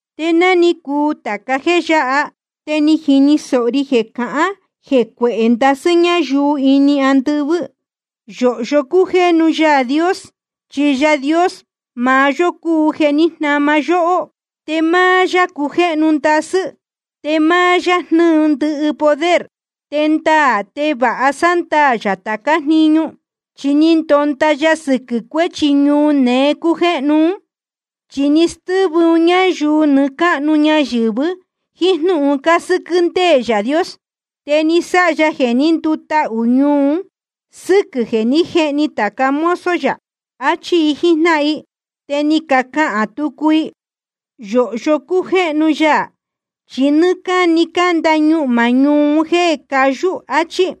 Te ná ni cuu tāca jéē yáha, te ni jini sōho ri jeē cahán jee cuehē ndasɨ́ ñáyuu ini andɨvɨ́: Yōhyo cújéhnu Yaā Dios. Chi Yaā Dios maá yó cúu jeē ní jnama yóhó. Te máá yá cujéhnu ndasɨ́, te máá yá jnɨ́ɨ ndɨhɨ poder. Te ndaā te vāha sándaā yā tācá jniñu, chi ni ndonda ya sɨquɨ̄ cuéchi ñuu neé cújéhnu ún. Chi ni stɨ́vɨ un ñáyuu nɨɨ́ cáhnu ñayɨ̄vɨ jíín jnúhun cásɨ́quɨ́ ndéē Yaā Dios. Te ni sáha ya jeē ní ndutahū ñuu un sɨ́quɨ̄ jeē ní jehni tāca mozo yā. Achí i jíjnáhan i. Te ni cacahān tucu i: Yōhyo cújéhnu ya. Chi nɨ́ɨ́ cáni canda ñuhmā ñuu un jéē cayú, achí.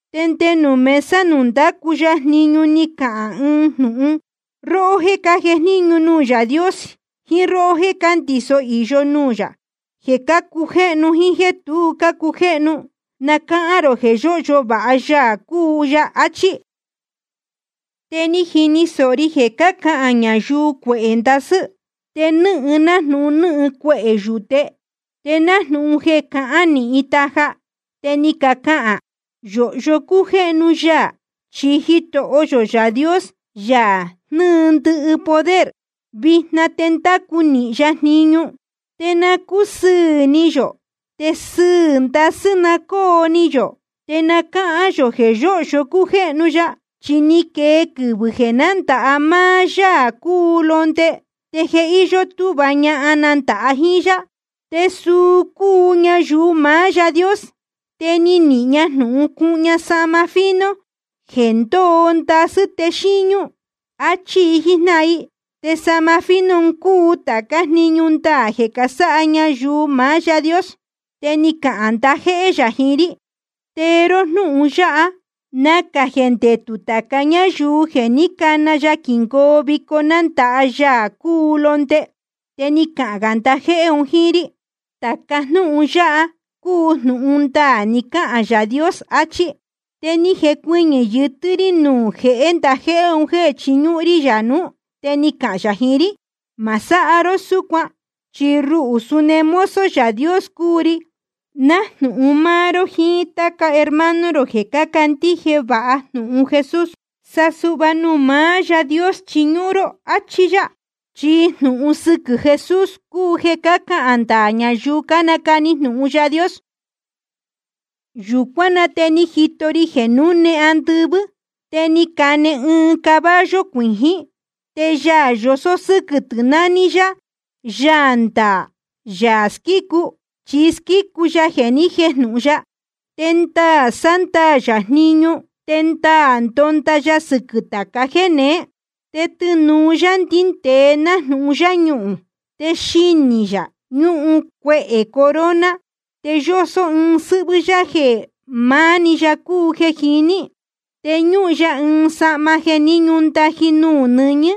Te nde nuū mesa nuū ndácu ya jniñu ni cahān ɨɨn jnūhun: Róhó jéē cájejníñu nuū Yaā Dios, jíín róhó jéē cándiso īyo nuū yā, jeē cácujéhnu jíín jéē tu cácujéhnu, na cáhán rō jeē yóhyo vāha Yaā cúu ya. Achí. Te ni jini sōho ri jeē cácahān ñayuu cuehē ndasɨ́, te nɨ́hɨn nájnūhun nɨ́hɨn cuehē yūte, te nájnūhun jeē cahán nīhin taja. Te ni cacahān: Yōhyo cújéhnu ya. Chi Jitoho yō Yaā Dios, Yaā jnɨ́ɨ ndɨhɨ poder, vijna te ndácu nīhin ya jniñu. Te na cúsɨɨ̄ ni yō, te sɨɨ̄ ndasɨ́ na cóo ni yō, te na cáhán yō jeē yóhyo cújéhnu ya. Chi ni quee quɨvɨ̄ jeē nándāha máá Yaā cúu Londe. Te je íyó túhva ñahan nandāha jíín yá, te suu cúu ñayuu maá Yaā Dios. Te ni nihīn ña jnūhun cuhun ña sahma fino jeē ndóo ndasɨ́ te xíñú. Achí i jíjnáhan i. Te sahma fino un cúu tācá jniñu ndaā jeē casáha ñayuu maá Yaā Dios. Te ni cahān ndajéhé yā jiín rí: Tee ró jnúhun yáha: Nacā jeē ndetū tāca ñáyuu jeē ní cana ya quingoo vico nándāha Yaā cúu Londe. Te ni cahān gā ndajéhé un jíín rí: Tāca jnúhun yáha cúu jnūhun ndaā ni cahān Yaā Dios, achí yá. Te ni jecuɨñɨ̄ yɨtɨ́ rí nuū jehé ndajéhé un jéē chiñúhún rí yā nuú. Te ni cahān yā jiín rí: Ma sáha ró súcuan. Chi ruhū suni mozo Yaā Dios cúu ri, nájnūhun máá ró jiín táca hermano rō jeē cácandíje vāha jnūhun Jesús. Sa suhva nuū maá Yaā Dios chiñúhún ró. Achí yá. Chi jnūhun sɨquɨ̄ Jesús cúu jeē cácahān ndaā ñayuu cánacani jnūhun Yaā Dios. Yūcuán na te ni jito ri jeē núne andɨvɨ́. Te ni cane ɨɨn caballo cuijín, te Yaā yosó sɨ́quɨ̄ tɨ̄ naní yá Yaā ndaā, Yaā squícu, chi squícu ya jeē ni jéjnūhun ya. Te ndaā sándaā yā jniñu te ndaā ndónda ya sɨquɨ̄ tāca jéneé. Te tɨnūu yá ndíndēe nájnūhun yáñuhūn. Te xinī yā ñúhun cuehē corona. Te yósó ɨɨn sɨ́hvɨ́ yá jeē maá‑ni ya cúu jeē jiní. Te ñúhun ya ɨɨn sahma jeē ni ñúndaji nuū nɨñɨ́,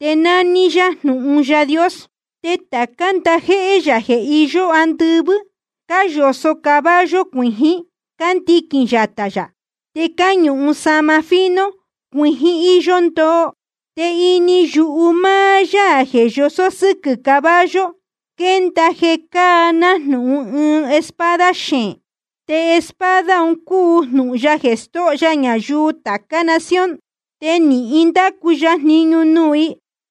te nání yá Jnūhun Yaā Dios. Te tācá ndajéhé yā jeē iyó andɨvɨ́, cáyosō caballo cuijín, cándiquīn yatā yā. Te cáñuhun sahma fino cuijín íyó ndoo. Te ini yuhu máá Yaā jeē yosó sɨ́quɨ̄ caballo, quénda jeē cáa nájnūhun ɨɨn espada xeēn. Te espada un cúu jnūhun ya jeē stóho ya ñayuu tācá nación. Te nīhin ndacu ya jniñu nuū i.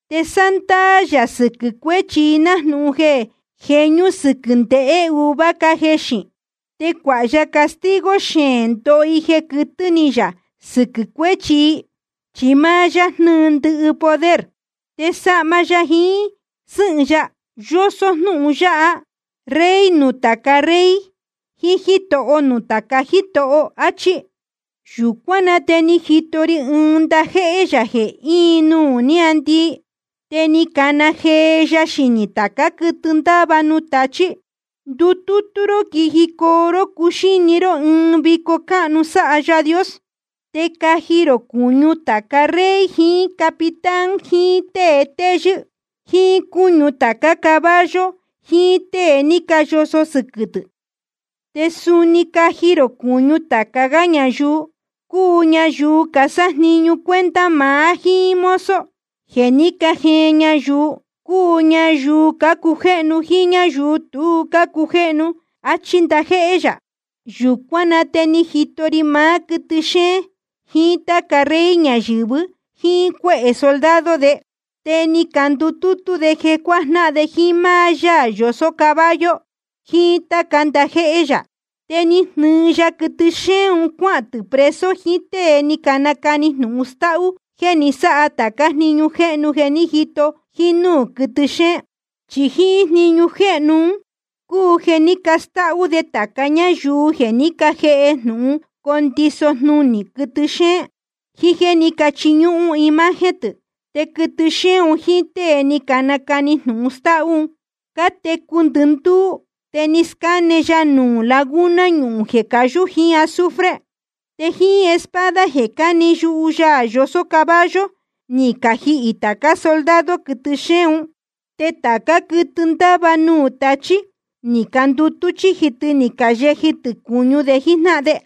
Te sándaā yā sɨquɨ̄ cuéchi i nájnūhun jeē jeñú sɨquɨ̄ ndehē uva cájexīn. Te cuāha ya castigo xeēn ndoho i jeē quɨtɨ́ ni yā sɨquɨ̄ cuéchi i. Chi máá yá jnɨ́ɨ ndɨhɨ poder. Te sahma ya jiín sɨ́hɨn ya yosó jnúhun yáha: Rey nuū tāca rey jiín Jítoho nuū tāca jítoho, áchí. Yūcuán na te ni jito ri ɨɨn ndajéhé yā jeē íin nuū níāndii. Te ni cana jee ya xinī tācá quɨtɨ ndáva nuū tachí: Ndutútú ró quijicoo ró cuxíni ró ɨɨn vico cáhnu sáha Yaā Dios. Te caji rō cūñu tāca rey jiín capitán jiín tée téyɨ́, jíín cúñu tācá caballo jiín tée ni cayosō sɨquɨ̄ tɨ̄. Te suni caji rō cūñu tāca gá ñayuu, cúu ñayuu casájniñu cuenta maá jíín mozo jeē ní cajeen ñayuu, cúu ñayuu cácujéhnu jíín ñáyuu tu cácujéhnu. Achí ndajéhé yā. Yūcuán na te ni jito ri maá quɨtɨ xéén jiín táca rey ñayɨ̄vɨ jíín cuéhē soldado de. Te ni candutútú de jeē cuajnáhan de jíín máá Yaā yosó caballo jiín táca ndajéhé yā. Te ni jnɨɨ ya quɨtɨ xéén cuahān tɨ̄ preso jiín tée ni nacani jnūhun stáhú jeē ni sáha tācá jniñu jéhnu jeē ní jito jínúū quɨtɨ xéén. Chi jíín jniñu jéhnu un cúu jeē ni stáhú de tāca ñáyuu jeē ní cajēhe jnūhun condiso jnunī quɨtɨ xéén, jiín jéē ní cachiñúhún imagen tɨ̄. Te quɨtɨ xéén un jíín tée ni nacani jnūhun stáhú un, cátecu ndɨndúú te ni scáne ya nuū laguna ñuhūn jeē cayú jiín azufre. Te jíín espada jeē cáne yuhu Yaā yosó caballo ni cajihī tācá soldado quɨtɨ xéén un. Te tācá quɨtɨ ndáva nuū tachí ni candutú chíji tɨ ni cayeji tɨ̄ cūñu de jíjnáhan de.